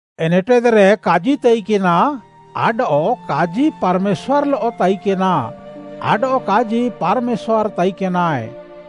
ଏନେଟେଦ୍‌ରେ କାଜି ତାଇକେନା, ଆଡଃ କାଜି ପାର୍‌ମେଶ୍ୱାର୍‌ଲଃ ତାଇକେନା, ଆଡଃ କାଜି ପାର୍‌ମେଶ୍ୱାର୍‌ ତାଇକେନାଏ।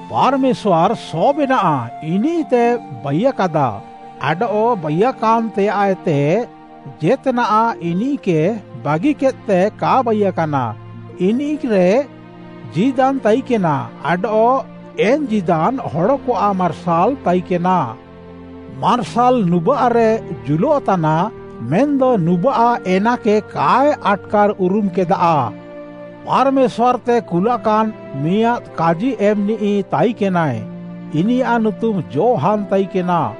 ପାର୍‌ମେଶ୍ୱାର୍‌ ସବେନାଃ ଇନିଃତେ ବାଇୟାକାଦା, ଆଡଃ ବାଇୟାକାନ୍‌ ତେୟାଃଏତେ ଜେତ୍‌ନାଃ ଇନିଃକେ ବାଗିକେଦ୍‌ତେ କା ବାଇୟାକାନା, ଇନିଃରେ ଜୀଦାନ୍‌ ତାଇକେନା ଆଡଃ ଏନ୍‌ ଜୀଦାନ୍‌ ହଡ଼କଆଃ ମାର୍ସାଲ୍‌ ତାଇକେନା। ମାର୍ସାଲ୍‌ ନୁବାଃରେ ଜୁଲଃତାନା, ମେନ୍‌ଦ ନୁବାଃ ଏନାକେ କାଏ ଆଟ୍‌କାର୍‌ଉରୁମ୍‌କେଦାଃ। ପାର୍‌ମେଶ୍ୱାର୍‌ତେ କୁଲାକାନ୍‌ ମିଆଁଦ୍‌ କାଜିଏମ୍‌ନିଃ ତାଇକେନାଏ, ଇନିୟାଃ ନୁତୁମ୍‌ ଯୋହାନ୍‌ ତାଇକେନା।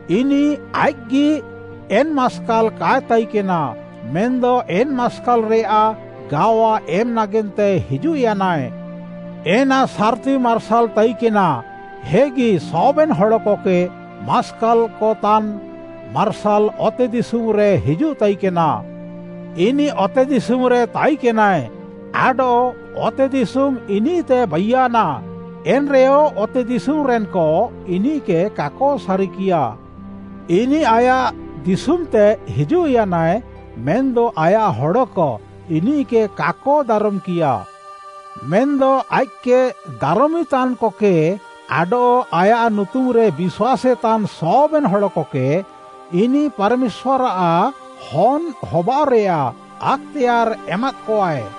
ଇନିଃ ଆଇଃକ୍‌ଗି ଏନ୍‌ ମାସ୍କାଲ୍ କାଏ ତାଇକେନା; ମେନ୍‌ଦ ଏନ୍‌ ମାସ୍କାଲ୍‌ରେୟାଃ ଗାୱା ଏମ୍‌ ନାଗେନ୍ତେ ହିଜୁଃୟାନାଏ। ଏନା ସାର୍‌ତି ମାର୍ସାଲ୍‌ ତାଇକେନା, ହେଗି ସବେନ୍‌ ହଡ଼କକେ ମାସ୍କାଲ୍‌କତାନ୍‌ ମାର୍ସାଲ୍‌ ଅତେଦିଶୁମ୍‌ରେ ହିଜୁଃତାଇକେନା। ଇନିଃ ଅତେଦିଶୁମ୍‌ରେ ତାଇକେନାଏ, ଆଡଃ ଅତେଦିଶୁମ୍‌ ଇନିଃତେ ବାଇୟାନା, ଏନ୍‌ରେୟ ଅତେଦିଶୁମ୍‌ରେନ୍‌କ ଇନିଃକେ କାକ ସାରିକିୟା। ଇନିଃ ଆୟାଃ ଦିଶୁମ୍‌ତେ ହିଜୁଃୟାନାଏ ମେନ୍‌ଦ ଆୟାଃ ହଡ଼କ ଇନିଃକେ କାକ ଦାରମ୍‌କିୟାଃ। ମେନ୍‌ଦ ଆଇଃକ୍‌କେ ଦାରମିତାନ୍‌କକେ, ଆଡଃ ଆୟାଃ ନୁତୁମ୍‌ରେ ବିଶ୍ୱାସେତାନ୍‌ ସବେନ୍‌ ହଡ଼କକେ ଇନିଃ ପାର୍‌ମେଶ୍ୱାର୍‌ଆଃ ହନ୍‌ ହବାଅଃରେୟାଃ ଆକ୍‌ତେୟାର୍‌ ଏମାଦ୍‍କଆଏ।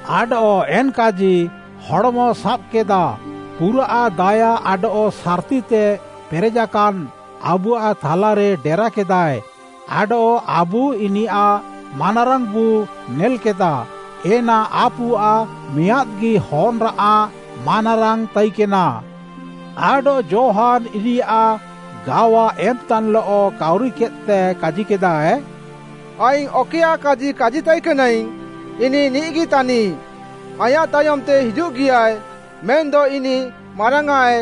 ଆଡଃ ଏନ୍‌ କାଜି ହଡ଼୍‌ମ ସାବ୍‌କେଦା, ପୁରାଃ ଦାୟା ଆଡଃ ସାର୍‌ତିତେ ପେରେଜାକାନ୍‌, ଆବୁଆଃ ଥାଲାରେ ଡେରାକେଦାଏ ଆଡଃ ଆବୁ ଇନିୟାଃ ମାନାରାଙ୍ଗ୍‌ବୁ ନେଲ୍‌କେଦା ଏନା ଆପୁଆଃ ମିଆଁଦ୍‌ଗି ହନ୍‌ଆଃ ମାନାରାଙ୍ଗ୍‌ ତାଇକେନା। ଆଡଃ ଯୋହାନ୍‌ ଇନିୟାଃ ଗାୱା ଏମ୍‌ତାନ୍‌ଲଃ, କାଉରିକେଦ୍‌ତେ କାଜିକେଦାଏ, “ଆଇଙ୍ଗ୍‌ ଅକଏୟାଃ କାଜି କାଜିତାଇକେନାଇଙ୍ଗ୍‌ ଇନିଃ ନିଃଗିତାନିଃ, ‘ଆଇଁୟାଃ ତାୟମ୍‌ତେ ହିଜୁଃଗିଆଏ, ମେନ୍‌ଦ ଇନିଃ ମାରାଙ୍ଗ୍‌ଆଁଏ,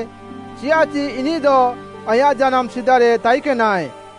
ଚିୟାଃଚି ଇନିଃଦ ଆଇଁୟାଃ ଜାନାମ୍‌ ସିଦାରେ ତାଇକେନାଏ।’”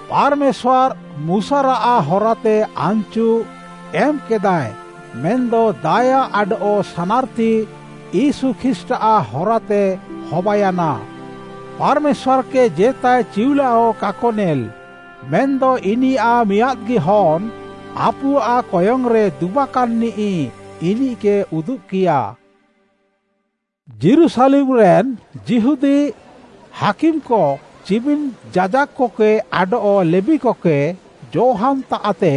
ପାର୍‌ମେଶ୍ୱାର୍‌ ମୁଶାରାଃ ହରାତେ ଆନ୍‌ଚୁ ଏମ୍‍କେଦାଏ, ମେନ୍‌ଦ ଦାୟା ଆଡଃ ସାନାର୍‌ତି ୟୀଶୁ ଖ୍ରୀଷ୍ଟ୍‌ଆଃ ହରାତେ ହବାୟାନା। ପାର୍‌ମେଶ୍ୱାର୍‌କେ ଜେତାଏ ଚିଉଲାହ କାକ ନେଲ୍‌, ମେନ୍‌ଦ ଇନିୟାଃ ମିଆଁଦ୍‌ଗି ହନ୍‌, ଆପୁଆଃ କୟଙ୍ଗ୍‌ରେ ଦୁବାକାନ୍‌ନିଃ ଇନିଃକେ ଉଦୁବ୍‌କିୟା। ଯୀରୁଶାଲେମ୍‌ରେନ୍‌ ଯିହୁଦୀ ହାକିମ୍‌କ ଚିମିନ୍‌ ଯାଜାକ୍‌କକେ ଆଡଃ ଲେବୀକକେ ଯୋହାନ୍‌ତାଃତେ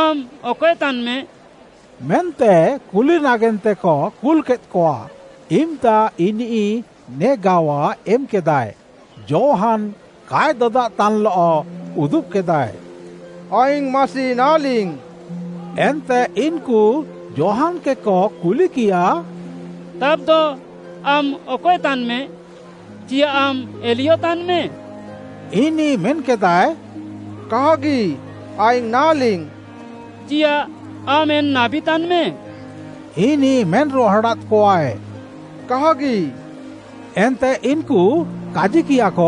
“ଆମ୍‌ ଅକଏ ତାନ୍‌ମେ” ମେନ୍ତେ କୁଲି ନାଗେନ୍ତେକ କୁଲ୍‌କେଦ୍‍କଆ। ଇମ୍‌ତା ଇନିଃ ନେ ଗାୱା ଏମ୍‌କେଦାଏ। ଯୋହାନ୍‌ କାଏ ଦଦାଦ୍‍ତାନ୍‌ଲଃ ଉଦୁବ୍‍କେଦାଏ, “ଆଇଙ୍ଗ୍‌ ମାସି ନାହାଁଲିଙ୍ଗ୍‌।” ଏନ୍ତେ ଇନ୍‌କୁ ଯୋହାନ୍‌କେକ କୁଲିକିୟା, “ତାବ୍‌ଦ ଆମ୍‌ ଅକଏ ତାନ୍‌ମେ?” “ଚିୟାଃ ଆମ୍‌ ଏଲିୟ ତାନ୍‌ମେ?” ଇନିଃ ମେନ୍‌କେଦାଏ, “କାହାଗି, ଆଇଙ୍ଗ୍‌ ନାହାଁଲିଙ୍ଗ୍‌।” “ଚିୟାଃ ଆମ୍‌ ଏନ୍‌ ନାବୀ ତାନ୍‌ମେ?” ଇନିଃ ମେନ୍‌ରୁହାଡ଼ାଦ୍‍କଆଏ, “କାହାଗି।” ଏନ୍ତେ ଇନ୍‌କୁ କାଜିକିୟାକ,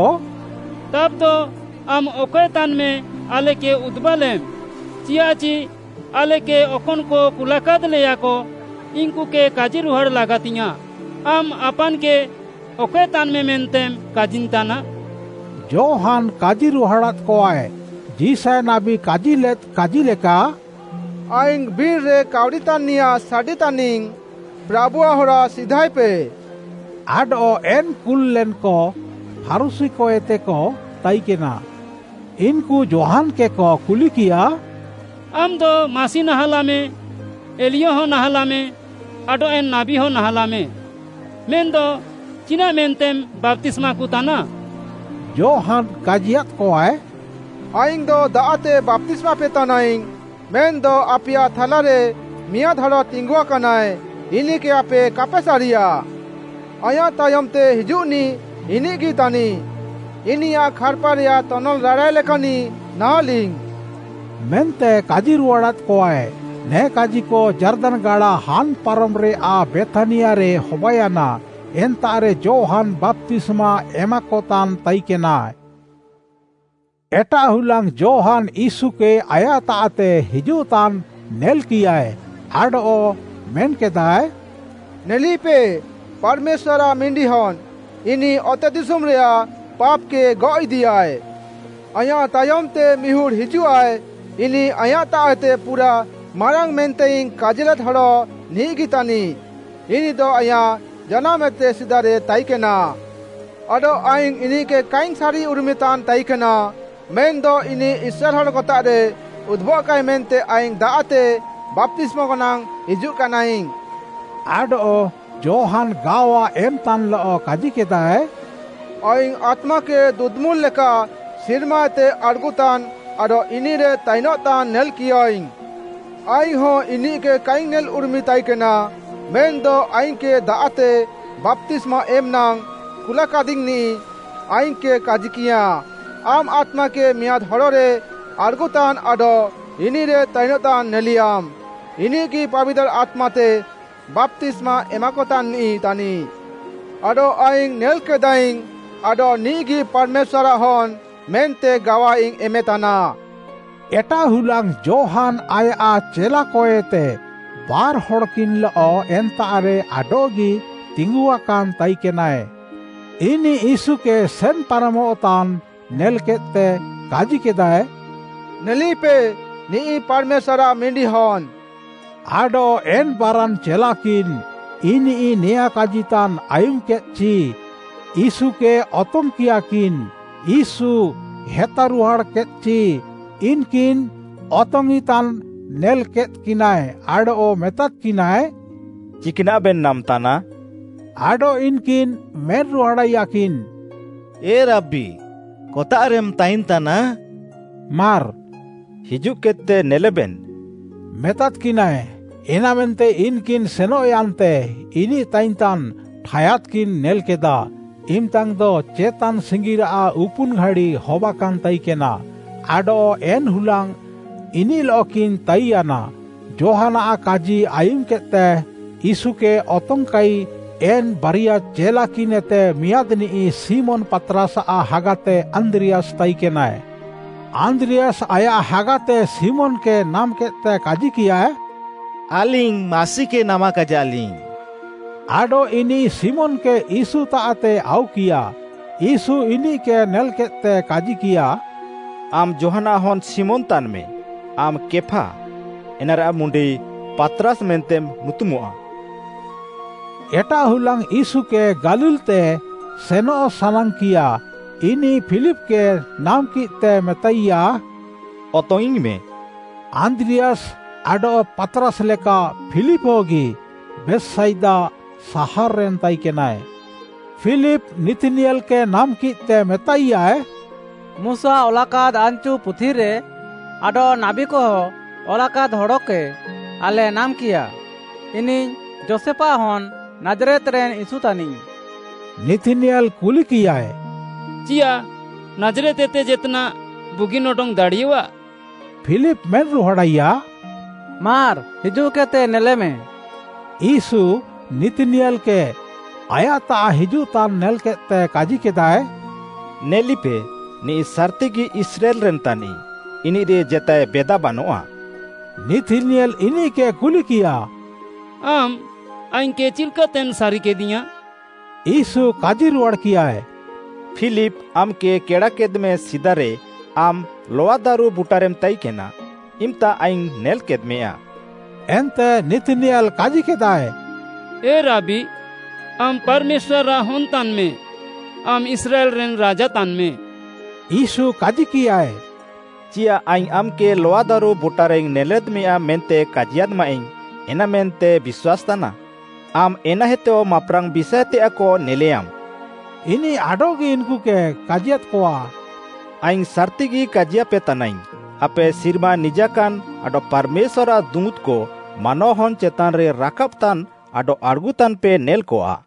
“ତାବ୍‌ଦ ଆମ୍‌ ଅକଏ ତାନ୍‌ମେ ଆଲେକେ ଉଦୁବାଲେମ୍‌, ଚିୟାଃଚି ଆଲେକେ ଅକନ୍‌କ କୁଲାକାଦ୍‌ଲେୟାକ, ଇନ୍‌କୁକେ କାଜିରୁହାଡ଼୍‌ ଲାଗାତିଙ୍ଗ୍‌ୟାଁଃ, ଆମ୍‌ ଆପାନ୍‌କେ ଅକଏ ତାନ୍‌ମେ ମେନ୍ତେମ୍‌ କାଜିନ୍‌ତାନା?” ଯୋହାନ୍‌ କାଜିରୁହାଡ଼ାଦ୍‌କଆଏ, ଯିଶାୟ ନାବୀ କାଜିଲେଦ୍ କାଜିଲେକା: “ଆଇଙ୍ଗ୍‌ ବିର୍‌ରେ କାଉରିତାନ୍‌ନିୟାଁଃ ସାଡ଼ି ତାନିଙ୍ଗ୍‌: ପ୍ରାଭୁଆଃ ହରା ସିଧାଏପେ।” ଆଡଃ ଏନ୍‌ କୁଲ୍‌ଲେନ୍‌କ ଫାରୁଶୀକଏତେକ ତାଇକେନା। ଇନ୍‌କୁ ଯୋହାନ୍‌କେକ କୁଲିକିୟା, “ଆମ୍‌ଦ ମାସି ନାହାଁଲାଃମେ, ଏଲିୟ ହଁ ନାହାଁଲାଃମେ ଆଡଃ ଏନ୍‌ ନାବୀହ ନାହାଁଲାଃମେ, ମେନ୍‌ଦ ଚିନାଃ ମେନ୍ତେମ୍‌ ବାପ୍ତିସ୍ମାକତାନା?” ଯୋହାନ୍‌ କାଜିୟାଦ୍‌କଆଏ, “ଆଇଙ୍ଗ୍‌ଦ ଦାଆଃତେ ବାପ୍ତିସ୍ମାପେ ତାନାଇଙ୍ଗ୍‌, ମେନ୍‌ଦ ଆପେୟାଃ ଥାଲାରେ ମିଆଁଦ୍‌ ହଡ଼ ତିଙ୍ଗୁଆକାନାଏ ଇନିଃକେ ଆପେ କାପେ ସାରିୟା। ଆଇଁୟାଃ ତାୟମ୍‌ତେ ହିଜୁଃନିଃ ଇନିଃଗି ତାନିଃ, ଇନିୟାଃ ଖାର୍‌ପାରେୟାଃ ତନଲ୍‌ ରାଡ଼ାଏ ଲେକାନ୍‌ନିଃ ନାହାଁଲିଙ୍ଗ୍‌” ମେନ୍ତେ କାଜିରୁହାଡ଼ାଦ୍‍କଆଏ। ନେ କାଜିକ ଯାର୍ଦାନ୍‌ ଗାଡ଼ା ହାନ୍‍ ପାରମ୍‍ରେୟାଃ ବେଥ୍‌ନିଆରେ ହବାୟାନା ଏନ୍ତାଃରେ ଯୋହାନ୍‌ ବାପ୍ତିସ୍ମା ଏମାକତାନ୍‍ ତାଇକେନାଏ। ଏଟାଃ ହୁଲାଙ୍ଗ୍‌ ଯୋହାନ୍‌ ୟୀଶୁକେ ଆୟାଃତାଃତେ ହିଜୁଃତାନ୍‍ ନେଲ୍‌କିୟାଏ, ଆଡଃ ମେନ୍‌କେଦାଏ, “ନେଲିପେ ପାର୍‌ମେଶ୍ୱାର୍‌ଆଃ ମିଣ୍ଡିହନ୍‌, ଇନିଃ ଅତେଦିଶୁମ୍‌ରେୟାଃ ପାପ୍‌କେ ଗଅଃ ଇଦିୟାଏ! ଆଇଁୟାଃ ତାୟମ୍‌ତେ ମିହୁଡ଼୍‌ ହିଜୁଃଆଏ ଇନିଃ ଆଇଁୟାଃତାଃଏତେ ପୁରାଃ ମାରାଙ୍ଗ୍‌ ମେନ୍ତେଇଙ୍ଗ୍‌ କାଜିଲେଦ୍ ହଡ଼ ନିଃଗି ତାନିଃ, ଇନିଃଦ ଆଇଁୟାଃ ଜାନାମ୍‌ଏତେ ସିଦାରେ ତାଇକେନା। ଆଡଃ ଆଇଙ୍ଗ୍‌ ଇନିଃକେ କାଇଙ୍ଗ୍‌ ସାରିଉରୁମିତାନ୍ ତାଇକେନା, ମେନ୍‌ଦ ଇନିଃ ଇସ୍ରାଏଲ୍‌ ହଡ଼କତାଃରେ ଉଦୁବଃକାଏ ମେନ୍ତେ ଆଇଙ୍ଗ୍‌ ଦାଆଃତେ ବାପ୍ତିସ୍ମାକ ନାଙ୍ଗ୍‌ ହିଜୁଃକାନାଇଙ୍ଗ୍‌।” ଆଡଃ ଯୋହାନ୍‌ ଗାୱା ଏମ୍‌ତାନ୍‌ଲଃ କାଜିକେଦାଏ, “ଆଇଙ୍ଗ୍‌ ଆତ୍ମାକେ ଦୁଦୁମୁଲ୍‌ ଲେକା ସିର୍ମାଏତେ ଆଡ଼୍‌ଗୁତାନ୍‍ ଆଡଃ ଇନିଃରେ ତାଇନଃତାନ୍‌ ନେଲ୍‍କିୟାଇଙ୍ଗ୍‌। ଆଇଙ୍ଗ୍‌ହଁ ଇନିଃକେ କାଇଙ୍ଗ୍‌ ନେଲ୍‌ଉରୁମି ତାଇକେନା ମେନ୍‌ଦ ଆଇଙ୍ଗ୍‌କେ ଦାଆଃତେ ବାପ୍ତିସ୍ମା ଏମ୍‌ ନାଙ୍ଗ୍‌ କୁଲ୍‌କାଦିଙ୍ଗ୍‌ନିଃ, ଆଇଙ୍ଗ୍‌କେ କାଜିକିୟାଁ, ‘ଆମ୍‌ ଆତ୍ମାକେ ମିଆଁଦ୍‌ ହଡ଼ରେ ଆଡ଼୍‌ଗୁତାନ୍ ଆଡଃ ଇନିଃରେ ତାଇନ୍‌ତାନ୍ ନେଲିୟାମ୍‌, ଇନିଃଗି ପାବିତାର୍‌ ଆତ୍ମାତେ ବାପ୍ତିସ୍ମା ଏମାକତାନ୍‍ନିଃ ତାନିଃ।’ ଆଡଃ ଆଇଙ୍ଗ୍‌ ନେଲ୍‍କେଦାଃଇଙ୍ଗ୍‌, ଆଡଃ ନିଃଗି ପାର୍‌ମେଶ୍ୱାର୍‌ଆଃ ହନ୍‌ ମେନ୍ତେ ଗାୱାଇଙ୍ଗ୍‌ ଏମେତାନା।” ଏଟାଃ ହୁଲାଙ୍ଗ୍‌ ଯୋହାନ୍‌ ଆୟାଃ ଚେଲାକଏତେ ବାର୍‍ହଡ଼୍‌କିନ୍‌ଲଃ ଏନ୍ତାଃରେ ଆଡଃଗି ତିଙ୍ଗୁଆକାନ୍‍ ତାଇକେନାଏ। ଇନିଃ ୟୀଶୁକେ ସେନ୍‍ପାରମଃତାନ୍ ନେଲ୍‍କେଦ୍‍ତେ କାଜିକେଦାଏ, “ନେଲିପେ, ନିଃ ପାର୍‌ମେଶ୍ୱାର୍‌ଆଃ ମିଣ୍ଡିହନ୍‌।” ଆଡଃ ଏନ୍‍ ବାରାନ୍‌ ଚେଲାକିନ୍‍ ଇନିଃ ନେଆଁଁ କାଜିତାନ୍‌ ଆୟୁମ୍‌କେଦ୍‌ଚି ୟୀଶୁକେ ଅତଙ୍ଗ୍‌କିୟାକିନ୍‌ ୟୀଶୁ ହେତାରୁହାଡ଼୍‌କେଦ୍‍ଚି, ଇନ୍‌କିନ୍‌ ଅତଙ୍ଗ୍‌ଇଁତାନ୍‌ ନେଲ୍‍କେଦ୍‍କିନାଏ ଆଡଃ ମେତାଦ୍‌କିନାଏ, “ଚିକ୍‌ନାଃବେନ୍ ନାମ୍‌ତାନା?” ଆଡଃ ଇନ୍‌କିନ୍‌ ମେନ୍‌ରୁହାଡ଼ାଇୟାକିନ୍‌, “ଏ ରାବି” କତାଃରେମ୍‌ ତାଇନ୍‍ତାନା? ମାର୍‌ “ହିଜୁଃକେଦ୍‍ତେ ନେଲେବେନ୍‍” ମେତାଦ୍‍କିନାଏ। ଏନାମେନ୍ତେ ଇନ୍‌କିନ୍‌ ସେନଃୟାନ୍ତେ ଇନିଃ ତାଇନ୍‍ତାନ୍‍ ଠାୟାଦ୍‍କିନ୍‍ ନେଲ୍‍କେଦାଃ, ଇମ୍‍ତାଙ୍ଗ୍‌ଦ ଚେତାନ୍ ସିଙ୍ଗିରାଃ ଉପୁନ୍‌ ଘାଡ଼ି ହବାକାନ୍‍ ତାଇକେନା, ଆଡଃ ଏନ୍‍ ହୁଲାଙ୍ଗ୍‌ ଇନିଃଲଃକିନ୍‌ ତାଇନ୍‍ୟାନା, ଯୋହାନ୍‌ଆଃ କାଜି ଆୟୁମ୍‌କେଦ୍‌ତେ ୟୀଶୁକେ ଅତଙ୍ଗ୍‌କାଇ ଏନ୍‌ ବାରିଆ ଚେଲାକିନ୍ଏତେ ମିଆଁଦ୍‌ନିଃ ଶିମୋନ୍‌ ପାତ୍‌ରାସ୍‌ଆଃ ହାଗାତେ ଆନ୍ଦ୍ରିୟାସ୍‌ ତାଇକେନାଏ। ଆନ୍ଦ୍ରିୟାସ୍‌ ଆୟାଃ ହାଗାତେ ଶିମୋନ୍‌କେ ନାମ୍‌କେଦ୍‌ତେ କାଜିକିୟା, “ଆଲିଙ୍ଗ୍‌ ମାସିକେ ନାମାକାଇଜାଲିଙ୍ଗ୍‌।” ଆଡଃ ଇନିଃ ଶିମୋନ୍‌କେ ୟୀଶୁତାଃତେ ଆଉକିୟା, ୟୀଶୁ ଇନିଃକେ ନେଲ୍‍କେଦ୍‍ତେ କାଜିକିୟା, “ଆମ୍‌ ଯୋହାନ୍‌ଆଃ ହନ୍‌ ଶିମୋନ୍‌ ତାନ୍‌ମେ, ଆମ୍‌ କେଫା, ଏନାରେୟାଃ ମୁଣ୍ଡି ‘ପାତ୍‌ରାସ୍‌’ ମେନ୍ତେମ୍‌ ନୁତୁମଃଆ।” ଏଟାଃ ହୁଲାଙ୍ଗ୍‌ ୟୀଶୁକେ ଗାଲିଲ୍‌ତେ ସେନଃ ସାନାଙ୍ଗ୍‌କିୟା। ଇନିଃ ଫିଲିପ୍‌କେ ନାମ୍‌କିଃତେ ମେତାଇୟାଏ, “ଅତଙ୍ଗ୍‌ଇଙ୍ଗ୍‌ମେ।” ଆନ୍ଦ୍ରିୟାସ୍‌ ଆଡଃ ପାତ୍‌ରାସ୍‌ଲେକା ଫିଲିପ୍‌ ହଗି ବେଥ୍‌ସାଇଦା ସାହାର୍‌ରେନ୍‌ ତାଇକେନାଏ। ଫିଲିପ୍‌ ନିଥ୍‌ନିୟେଲ୍‌କେ ନାମ୍‌କିଃତେ ମେତାଇୟାଏ, “ମୁଶା ଅଲାକାଦ୍‌ ଆନ୍‌ଚୁ ପୁଥିରେ ଆଡଃ ନାବୀକହ ଅଲାକାଦ୍‌ ହଡ଼କେ ଆଲେ ନାମାକାଇୟାଃ ଇନିଃ ଯୋଷେଫ୍‌ ହନ୍‌ ନାଜ୍‌ରେତ୍‌ରେନ୍‌ ୟୀଶୁ ତାନିଃ।” ନିଥ୍‌ନିୟେଲ୍‌ କୁଲିକିୟାଏ, “ଚିୟାଃ ନାଜ୍‌ରେତ୍‌ଏତେ ଜେତ୍‌ନାଃ ବୁଗିନ୍‌ ଅଡଙ୍ଗ୍‌ଦାଡ଼ିଅଃଆ?” ଫିଲିପ୍‌ ମେନ୍‌ରୁହାଡ଼ାଇୟା, “ମାର୍‌ ହିଜୁଃକେଦ୍‍ତେ ନେଲେମେ।” ୟୀଶୁ, ନିଥ୍‌ନିୟେଲ୍‌କେ ଆୟାଃତାଃ ହିଜୁଃତାନ୍‌ ନେଲ୍‌କେଦ୍‌ତେ କାଜିକେଦାଏ, “ନେଲିପେ, ନିଃ ସାର୍‌ତିଗି ଇସ୍ରାଏଲ୍‌ରେନ୍‌ ତାନିଃ, ଇନିଃରେ ଜେତାଏ ବେଦା ବାନଆଃ।” ନିଥ୍‌ନିୟେଲ୍‌ ଇନିଃକେ କୁଲିକିୟା, “ଆମ୍‌ ଆଇଙ୍ଗ୍‌କେ ଚିଲ୍‌କାତେମ୍‌ ସାରିକେଦିୟାଁ?” ୟୀଶୁ କାଜିରୁହାଡ଼୍‌କିୟାଏ, “ଫିଲିପ୍‌ ଆମ୍‌କେ କେଡ଼ାକେଦ୍‌ମେ ସିଦାରେ ଆମ୍‌ ଲଆଦାରୁ ବୁଟାରେମ୍‌ ତାଇକେନା, ଇମ୍‌ତା ଆଇଙ୍ଗ୍‌ ନେଲ୍‌କେଦ୍‍ମେୟା।” ଏନ୍ତେ ନିଥ୍‌ନିୟେଲ୍‌ କାଜିକେଦାଃଏ, “ଏ ରାବି, ଆମ୍‌ ପାର୍‌ମେଶ୍ୱାର୍‌ଆଃ ହନ୍‌ ତାନ୍‌ମେ; ଆମ୍‌ ଇସ୍ରାଏଲ୍‌ରେନ୍‌ ରାଜା ତାନ୍‌ମେ।” ୟୀଶୁ କାଜିକିୟାଏ, “ଚିୟାଃ ଆଇଙ୍ଗ୍‌ ଆମ୍‌କେ ଲଆଦାରୁ ବୁଟାରେଇଙ୍ଗ୍‌ ନେଲ୍‌ଲେଦ୍‍ମେୟା ମେନ୍ତେ କାଜିୟାଦ୍‌ମାଇଙ୍ଗ୍‌, ଏନାମେନ୍ତେମ୍‌ ବିଶ୍ୱାସେତାନା? ଆମ୍‌ ଏନାଏତେହ ମାପ୍‌ରାଙ୍ଗ୍‌ ବିଷାଏତେୟାଃକ ନେଲେୟାମ୍‌।” ଇନିଃ ଆଡଃଗି ଇନ୍‌କୁକେ କାଜିୟାଦ୍‌କଆ, “ଆଇଙ୍ଗ୍‌ ସାର୍‌ତିଗି କାଜିୟାପେ ତାନାଇଙ୍ଗ୍‌ ଆପେ ସିର୍ମା ନିଜାକାନ୍‌ ଆଡଃ ପାର୍‌ମେଶ୍ୱାର୍‌ଆଃ ଦୁଁତ୍‌କ ମାନୱାହନ୍‌ ଚେତାନ୍‌ରେ ରାକାବ୍‌ତାନ୍‌ ଆଡଃ ଆଡ଼୍‌ଗୁନ୍‌ତାନ୍‌ପେ ନେଲ୍‌କଆ।”